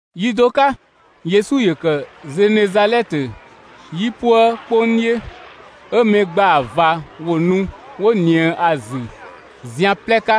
Yi do 'ka Yesu ‑yö ‑kë Zenezalɛtö 'yipuë 'kpong 'dhiö, 'ö mɛ ‑gbaa ꞊va ‑wo nu 'wo ꞊nië ‑a ‑zü zian 'plɛ 'ka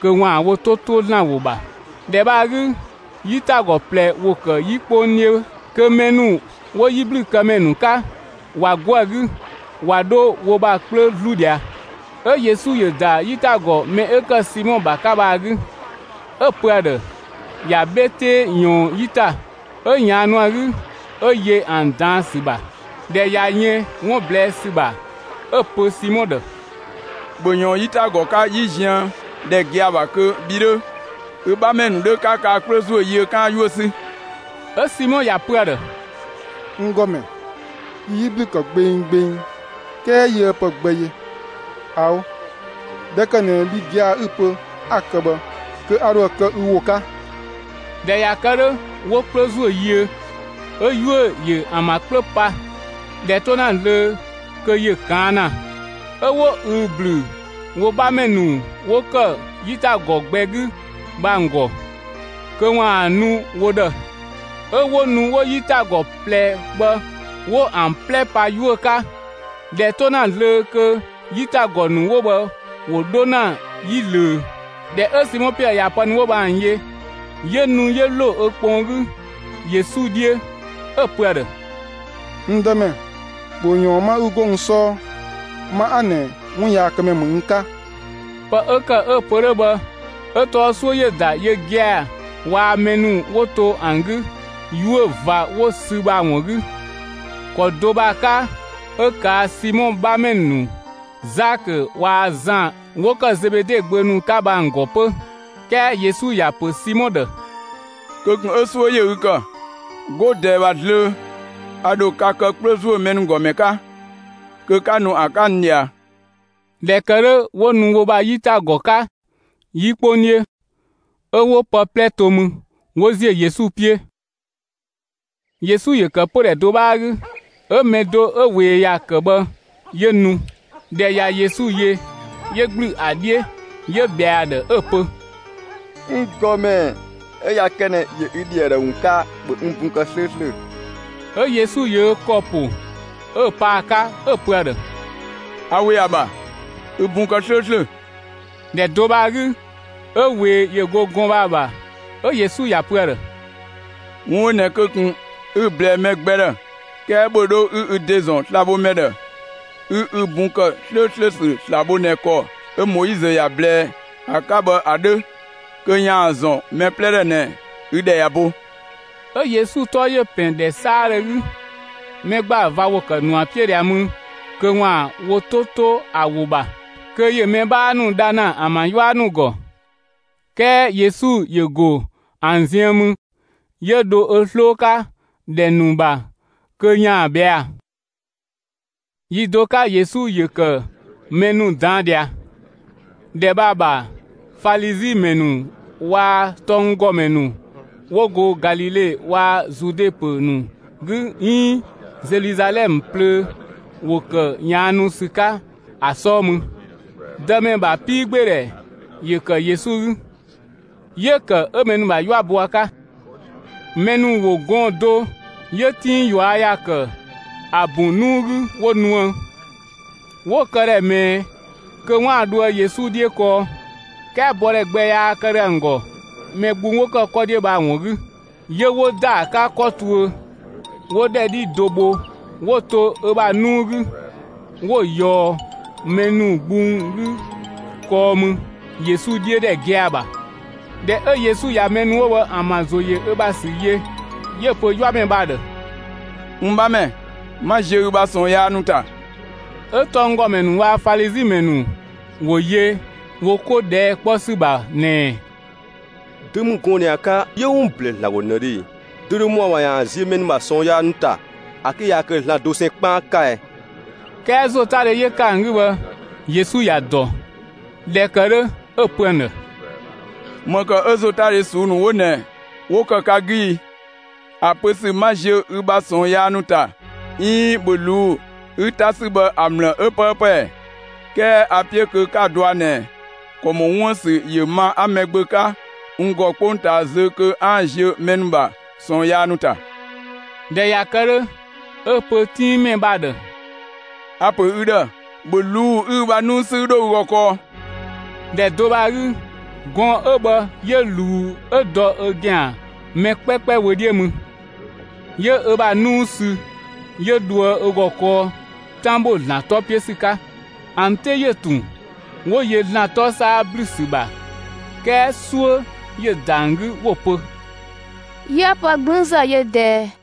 kö ‑waan wo 'to ‑to ‑Zlan ‑wo ‑bha. ‑Dhɛ bhë ‑a 'gü 'yitagɔ ꞊plɛ ‑wo ‑kë 'yi 'kpong 'dhiö kö mɛ ‑nu 'wo 'yiblükëmɛ ‑nu 'ka, ꞊wa 'go ‑a 'gü ꞊wa 'dho wo ‑bha 'kplö 'zlu ꞊dhia. 'Ö Yesu ‑yö ‑da 'yitagɔ mɛ 'ö ‑kë Simɔ ‑bha 'ka bhë ‑a 'gü, 'ö‑ pö ‑a ‑dhë ‑ya 'bhe 'tee ꞊yɔɔn 'yi ‑ta; 'ö ꞊yaannu ‑a 'gü 'ö yö ‑an ꞊daan' ‑sü ‑bha. ꞊Dhɛ ꞊ya yën 'wun ꞊blɛɛ' ‑sü ‑bha, 'ö‑ pö Simɔ ‑dhë: «‑Bhö ꞊yɔɔn 'yitagɔ 'ka 'yi ziëndhɛ gia‑ ‑bha kö bhi 'dhö, ü 'bhamɛ ‑nu 'dhö 'ka ka ‑bha 'kplö ‑zuö yiö 'kaan‑ 'yuö‑ 'sü!» 'Ö Simɔ ‑ya pö ‑a ‑dhë: «N ‑Gɔmɛ, yi 'yi ‑blü ‑kë gbenggbeng, 'kɛɛ yiëë pë gbɛ yö. ꞊Ao', ꞊dhɛ ‑kë ꞊nɛ bhi gia‑ 'ü‑ pö 'a‑ kë bhë kö a ‑dho ‑a kë ü ‑wo 'ka.» ꞊Dhɛ ꞊ya kë 'dhö, 'wo 'kplö ‑zuö yiö, 'ö 'yuö‑ ‑yö ‑an ‑bha 'kplö pa, ꞊dhɛ 'to ‑na zlöö kö ‑yö ꞊kaan' ‑na. 'Ö 'wo ꞊üü‑ ‑blü wo 'bhamɛ ‑nu 'wo ‑kë 'yitagɔ gbɛ 'gü bhë ‑an ‑gɔ kö ‑waan nu wo ‑dhë. 'Ö 'wo nu 'wo 'yitagɔ ꞊plɛ bhë 'wo ‑an 'plɛ pa 'yuö‑ 'ka, ꞊dhɛ 'to ‑na zlöö kö 'yitagɔ ‑nu 'wo bhë ‑wo 'dho ‑na 'yi ꞊löö. ꞊Dhɛ 'ö Simɔ Piɛɛ ꞊ya pë ‑nu 'wo bhë ‑an yö, 'yö nu 'yö ‑lo ö kpɔn 'gü Yesu 'dhiö, 'ö‑ pö ‑a ‑dhë: «N Dëmɛ, ‑bhö ꞊yɔɔn 'ma 'ü 'go n 'sɔɔ; ma 'a ꞊nɛ 'wunyaakëmɛ ‑mü n 'ka!» Pë 'ö ‑kë 'ö‑ pö 'dhö bhë 'ö tɔɔ 'suö ‑yö ‑da yö gia‑ waa‑ mɛ ‑nu 'wo to ‑an 'gü 'yuö‑ ꞊va 'wo‑ sü bhë ‑a ‑wun 'gü. ‑Kɔ do bhë ‑a 'ka 'ö ꞊kaa' Simɔ 'bhamɛ ‑nu Zakö waa‑ Zan 'wo ‑kë Zebede gbö ‑nu 'ka bhë ‑an ‑gɔ 'pö. 'Kɛɛ Yesu ‑ya ‑pö Simɔ ‑dhë: «Kö ꞊kun 'ö 'suö ‑yö ü ‑kë! 'Go ꞊dɛɛ ‑bha zlöö a ‑dho ka kë 'kplö ‑zuö mɛ ‑nu ‑gɔ ‑mɛ 'ka kö 'ka nu ‑an 'ka n ꞊dhia.» ꞊Dhɛ ‑kë 'dhö 'wo nu wo ‑bha 'yitagɔ 'ka 'yi 'kpong 'dhiö, 'ö 'wo pë 'plɛ to mü 'wo ‑ziö Yesu 'piö. Yesu ‑yö ‑kë pödhɛ do 'bhaa 'gü, 'ö mɛ do 'ö ꞊wee ‑ya ‑kë bhë 'yö nu. ꞊Dhɛ ꞊ya Yesu yö, 'yö ‑gblü ‑a 'dhiö 'yö ꞊bhɛa ‑a ‑dhë 'ö‑ pö: «N ‑Gɔmɛ, 'ö ꞊ya kë ꞊nɛ ‑yö ü ‑dhi ‑a ‑dhë ‑wun 'ka, ‑bhö n bun kë 'slööslö!» 'Ö Yesu ‑yö ö ‑kɔ ‑po 'ö pa ‑a 'ka 'ö‑ pö ‑a ‑dhë: «A ‑we ‑a ‑bha, ü bun kë 'slööslö!» ‑Dhɛ do bhë ‑a 'gü, 'ö ꞊wee ‑yö go gɔɔn‑ 'ö bhë ‑a ‑bha. 'Ö Yesu ‑ya pö ‑a ‑dhë: «'Wun 'ö ꞊nɛ kö ꞊kun 'ü‑ ꞊blɛɛ mɛ gbɛ ‑dhë, 'kɛɛ ‑bhö 'dho 'ü ü ‑de ‑zɔn slabhomɛ ‑dhë 'ü ü bun ‑kë 'slööslö ‑sü sla‑ bho ꞊nɛ ‑kɔ 'ö Moizö ‑ya ꞊blɛɛ ‑a 'ka bhë ‑a 'dhö kö ‑yaan ‑a ‑zɔn mɛ 'plɛ ‑dhë ꞊nɛ ü ‑dhɛ ꞊ya bo!» 'Ö Yesu 'tɔ ‑yö ‑pɛn ‑dhɛ 'saadhö 'gü; mɛ ‑gbaa ꞊va ‑wo ‑kë ‑nu ‑a 'piö ꞊dhia mü kö ‑waan wo 'to 'to ‑a ‑wo ‑bha, kö ‑yö mɛ 'bhaa ‑nu dha ‑na ‑an ‑bha 'yua ‑nu ‑gɔ. 'Kɛɛ Yesu ‑yö ‑go ‑an ziën mü, 'yö dho ö 'sloo 'ka ‑dhɛ ‑nu ‑bha kö ‑yaan ꞊bhɛa'‑. Yi do 'ka Yesu ‑yö ‑kë mɛ ‑nu ꞊daan' ꞊dhia. ‑Dhɛ bhë ‑a ‑bha Falizi ‑mɛ ‑nu waa‑ tɔnggɔmɛ ‑nu 'wo go Galile waa‑ Zude ‑pö ‑nu 'gü 'iin Zeluzalɛmë plöö ‑wo ‑kë ꞊yaannu ‑sü 'ka ‑a 'sɔɔ mü. Dëmɛ ‑bha 'piigbeedhɛ ‑yö ‑kë Yesu 'gü, 'yö‑ ‑kë 'ö mɛ ‑nu ‑bha 'yua bo ‑a 'ka. Mɛ ‑nu ‑wo gɔɔn‑ do 'yö 'tinng ꞊yua' ‑ya ‑kë ‑a bun 'nuu 'gü 'wo nuë; 'wo‑ këdhɛ ꞊mɛɛ kö 'waan‑ dhoë Yesu 'dhiö kɔɔ. 'Kɛɛ bɔdhɛ gbɛ yaa kë ‑dhö ‑an ‑gɔ mɛ gbung 'wo ‑kë 'kɔ 'dhiö bhë ‑a ‑wun 'gü. 'Yö 'wo ‑da ‑a 'ka 'kɔ tuö, 'wo ‑dhɛ 'dhi do bho 'wo‑ to ö ‑bha 'nuu 'gü, 'wo‑ ꞊yɔɔ mɛ ‑nu gbung 'gü kɔɔ mü Yesu 'dhiö ‑dhɛ gia‑ ‑bha. ꞊Dhɛ 'ö Yesu ꞊ya mɛ ‑nu 'wo bhë ‑an ‑bha ‑zo ‑yö ö ‑bha ‑sü yö, 'yö‑ pö 'yuamɛ bhë ‑a ‑dhë: «N 'bhamɛ, 'ma ziö ü bha ꞊sɔɔn yaa ‑nu ‑ta.» 'Ö tɔnggɔmɛ ‑nu waa‑ Falizi ‑mɛ ‑nu ‑wo yö wo 'ko ꞊dhɛɛ' 'kpɔ ‑sü ‑bha ꞊nɛɛ: «Dö ‑mü gɔɔn‑ ꞊nɛ ‑a 'ka 'yö 'wun ꞊blɛɛ ‑Zlan ‑gɔ ꞊nëdhö e? Dö dho ‑mɔ ‑a ‑bha kö ‑yaan ziö mɛ ‑nu ‑bha ꞊sɔɔn yaa ‑nu ‑ta ‑a 'ke yaa kë ‑Zlan dosɛn 'kpaan 'ka ɛ?» 'Kɛɛ ‑zotadhe 'yö ‑kë ‑an 'gü bhë, Yesu ‑ya ‑dɔ; ꞊dhɛ ‑kë 'dhö, 'ö‑ pö ‑an ‑dhë: «‑Më ‑kë 'ö ‑zotadhe ꞊suu'‑ ‑nu 'wo ꞊nɛ 'wo ‑kë ka 'gü i? ‑A pö ‑sü ‹'ma ziö ü ‑bha ꞊sɔɔn yaa ‑nu ‑ta› 'iin ‹‑bhö ꞊luu'‑ 'ü 'ta 'sü› bhë ‑a ‑mlë 'ö 'pëëpë ‑ɛ? 'Kɛɛ a‑ 'piö kö 'ka‑ dɔa ꞊nɛ ‑kɔ ‑mɔ 'wuën‑ ‑sü ‑yö ma 'a Mɛgbö 'ka n ‑gɔ 'kpongtaa zö kö 'aan‑ ziö mɛ ‑nu ‑bha ꞊sɔɔn yaa ‑nu ‑ta.» ꞊Dhɛ ꞊ya kë 'dhö, 'ö‑ pö 'tinngmɛ bhë ‑a ‑dhë: «A‑ ‑pö ü ‑dhë, ‑bhö ꞊luu'‑ 'ü ü bha 'nuu 'sü 'ü 'dho ü ‑gɔ kɔɔ!» ‑Dhɛ do bhë ‑a 'gü, gɔɔn‑ 'ö bhë 'yö ꞊luu 'ö dɔ ö ‑gɛan mɛ 'kpɛkpɛ wö 'dhiö mü, 'yö ö bha 'nuu sü 'yö dhoë ö ‑gɔ kɔɔ 'tan ‑bho ‑Zlan 'tɔ 'piö ‑sü 'ka. ‑An 'te ‑yö ‑tun, 'wo yö ‑Zlan 'tɔ 'saa ‑blü ‑sü ‑bha, 'kɛɛ 'suö ‑yö ‑da ‑an 'gü 'wo‑ pö: «'Yië pë 'gblüünzë yö ꞊dɛɛ!»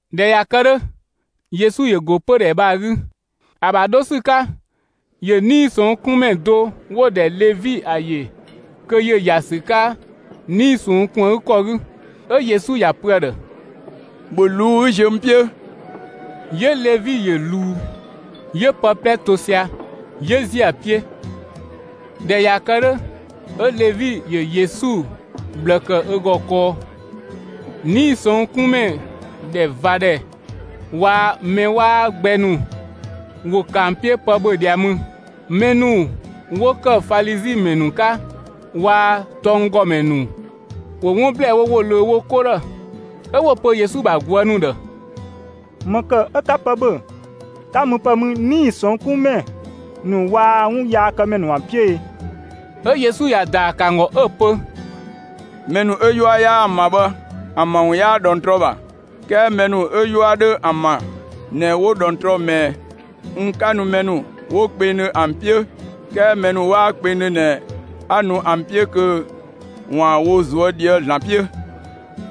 ꞊Dhɛ ꞊ya kë 'dhö, Yesu ‑yö ‑go pödhɛ bhë ‑a 'gü; ‑a ‑bha 'dho ‑sü 'ka, ‑yö 'nii‑ ꞊sɔnng' 'kun ‑mɛ do 'wo‑ ‑dhɛ Levi ‑a ‑yö kö ‑yö ‑ya ‑sü 'ka 'nii‑ ꞊sɔnng' ‑kun ‑a 'gü ‑kɔ 'gü. 'Ö Yesu ‑ya pö ‑a ‑dhë: «‑Bhö ꞊luu'‑ 'ü ziö n 'piö!» 'Yö Levi ‑yö ꞊luu, 'yö pë 'plɛ to sia‑, 'yö ‑ziö ‑a 'piö. ꞊Dhɛ ꞊ya kë 'dhö, 'ö Levi ‑yö Yesu ꞊bhlë ‑kë ö ‑gɔ kɔɔ. 'Nii‑ ꞊sɔnng' 'kun ‑mɛ ‑dhɛ ꞊va ‑dhɛ waa‑ mɛ 'waa gbɛ ‑nu, ‑wo ‑kë ‑an 'piö pë ‑bhö ꞊dhia mü. Mɛ ‑nu 'wo ‑kë Falizi ‑mɛ ‑nu 'ka waa‑ tɔnggɔmɛ ‑nu ‑wo 'wun ‑blɛɛ ‑wo ꞊löö wo 'ko ‑dhë, 'ö 'wo‑ pö Yesu ‑bha ꞊guë' ‑nu ‑dhë: «‑Më ‑kë 'ö 'ka pë ‑bhö, 'ka müpë mü 'nii‑ ꞊sɔnng' 'kun ‑mɛ ‑nu waa‑ 'wunyaakëmɛ ‑nu ‑an 'piö e?» 'Ö Yesu ‑ya ‑daa ‑kë ‑an ‑gɔ 'ö‑ pö: «Mɛ ‑nu 'ö 'yua 'yaa ‑an ‑bha bhë, ‑an ‑bha ‑wun 'yaa ꞊dhɔngtrɔ ‑bha, 'kɛɛ mɛ ‑nu 'ö 'yua 'dho ‑an ‑bha ꞊nɛ 'wo ꞊dhɔngtrɔ ꞊mɛɛ. N 'ka nu mɛ ‑nu 'wo kpengdhö ‑an 'piö, 'kɛɛ mɛ ‑nu 'waa kpengdhö ꞊nɛ 'a nu ‑an 'piö kö ‑waan wo ꞊zuö' ꞊dhië'‑ ‑Zlan 'piö.»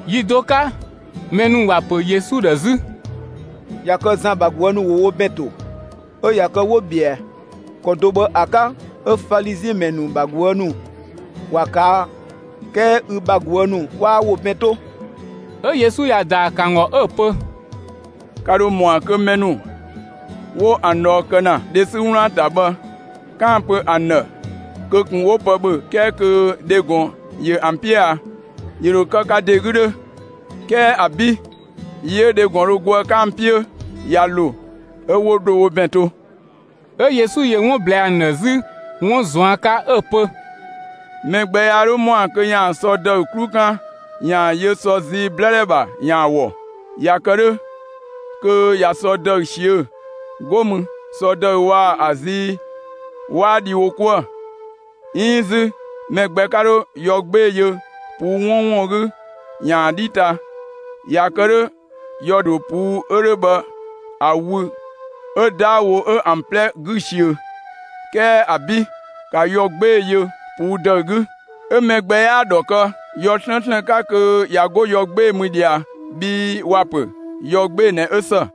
Yi do 'ka, mɛ ‑nu ‑wa ‑pö Yesu ‑dhë 'zü: «꞊Ya kë Zan ‑bha ꞊guë' ‑nu ‑wo wo ‑bɛn ‑to, 'ö ꞊ya kë 'wo ꞊bhɛa. ‑Kɔ do bhë ‑a 'ka, 'ö Falizi ‑mɛ ‑nu ‑bha ꞊guë' ‑nu ‑wa ꞊kaa'; 'kɛɛ ü bha ꞊guë' ‑nu 'waa wo ‑bɛn 'to.» 'Ö Yesu ‑ya ‑daa ‑kë ‑an ‑gɔ 'ö‑ pö: «Ka ‑dho ‑mɔa kö mɛ ‑nu 'wo ‑an ꞊dhɔɔ kë ‑na dhe 'sü 'wlaan‑ ‑ta bhë 'kaan‑ pö ‑an ‑dhë kö ꞊kun 'ö 'wo pë ‑bhö, 'kɛɛ kö dhe ‑gɔn ‑yö ‑an 'piö a? ‑Yö ‑dho kë ka ‑de 'gü 'dhö! 'Kɛɛ ‑abi', yi 'ö dhe ‑gɔn dho go ‑a 'ka ‑an 'piö ꞊ya ‑lo, 'ö 'wo dho wo ‑bɛn to.» 'Ö Yesu ‑yö 'wun ꞊blɛɛ ‑an ‑dhë 'zü 'wun ꞊zuan' 'ka 'ö‑ pö: «Mɛ gbɛ yaa 'dho ‑mɔa kö ‑yaan sɔ ‑dëü 'klu 'kan ‑yaan yö sɔ zii 'blëdhɛ ‑bha ‑yaan ‑a ‑wɔ. ꞊Ya kë 'dhö kö ꞊ya sɔ ‑dëü ꞊siö'‑; 'go mü sɔ ‑dëü waa‑ ‑a zii waa dhi wo 'kuë‑. 'Iin 'zü mɛ gbɛ 'ka 'dho yɔ 'gbee‑ yö ꞊puu' 'wɔɔnwɔn 'gü ‑yaan ‑a 'dhi ‑ta. ꞊Ya kë 'dhö yɔ ‑dho ꞊puu' 'ö 'dhö bhë ‑a wü 'ö 'daawo 'ö ‑an 'plɛ 'gü‑ ꞊siö. 'Kɛɛ ‑abi'! ‑Ka yɔ 'gbee‑ yö ꞊puu' ‑dëü 'gü! 'Ö mɛ gbɛ 'yaa‑ ‑dhɔ kë yɔ 'slëënslën 'ka kö ꞊ya 'go yɔ 'gbee‑ mü ꞊dhia, bhii ‑wa pö: ‹Yɔ 'gbee‑ ꞊nɛ 'ö ‑së!›»